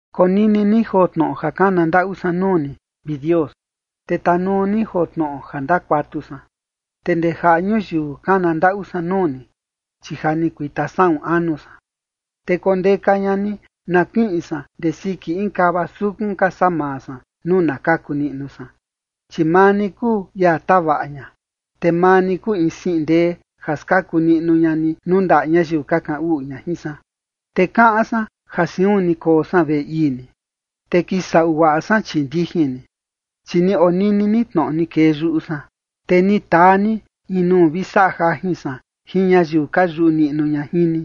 Konini ni joo tnoꞌo ja kana ndaꞌu san nuu ni, vi Dios, te tanuu ni joo tnoꞌo ja ndakuatu san. Te ndee jaꞌa ñuyiu kana ndaꞌu san nuu ni, chi ja ni kuita saꞌun anu san. Te kondeka ña ni na kiꞌin san ndee siki in kava sukun ka saa maa san nuu na kaku niꞌnu san. Chi maa ni kuu ia tavaꞌa ña, te maa ni kuu in siꞌin ndee ja skaku niꞌnu ña ni nuu ndaꞌa ñayiu ka kaꞌan uꞌu ña jin san. Te kaꞌan san ja siun ni koo san veꞌe ii ni, te kisaꞌu guaꞌa san chii ndijin ni. Chi ni onini ni tnoꞌo ni kee yuꞌu san, te ni taa ni in nuu vi saꞌa jajin san jin ñayiu ka yuꞌu niꞌnu ña jin ni.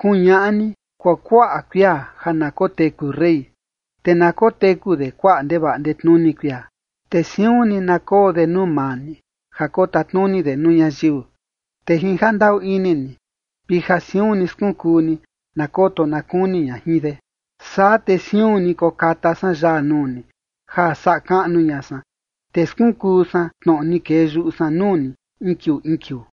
Kuñaꞌa ni kuakuaꞌa kuia ja na koteku rey, te na koteku de kuaꞌa ndevaꞌa ndetnuni kuia. Te siun ni na koo de nuu maa ni, ja kotatnuni de nuu ñayiu. Te jin jandaꞌu ini ni vi ja siun ni skunkuu ni, na koto na kuni ña jin de. Saa te siun ni kokata san yaa nuu ni ja saꞌa kaꞌnu ña san, te skunkuu san tnoꞌo ni kee yuꞌu san nuu ni in kiuu in kiuu.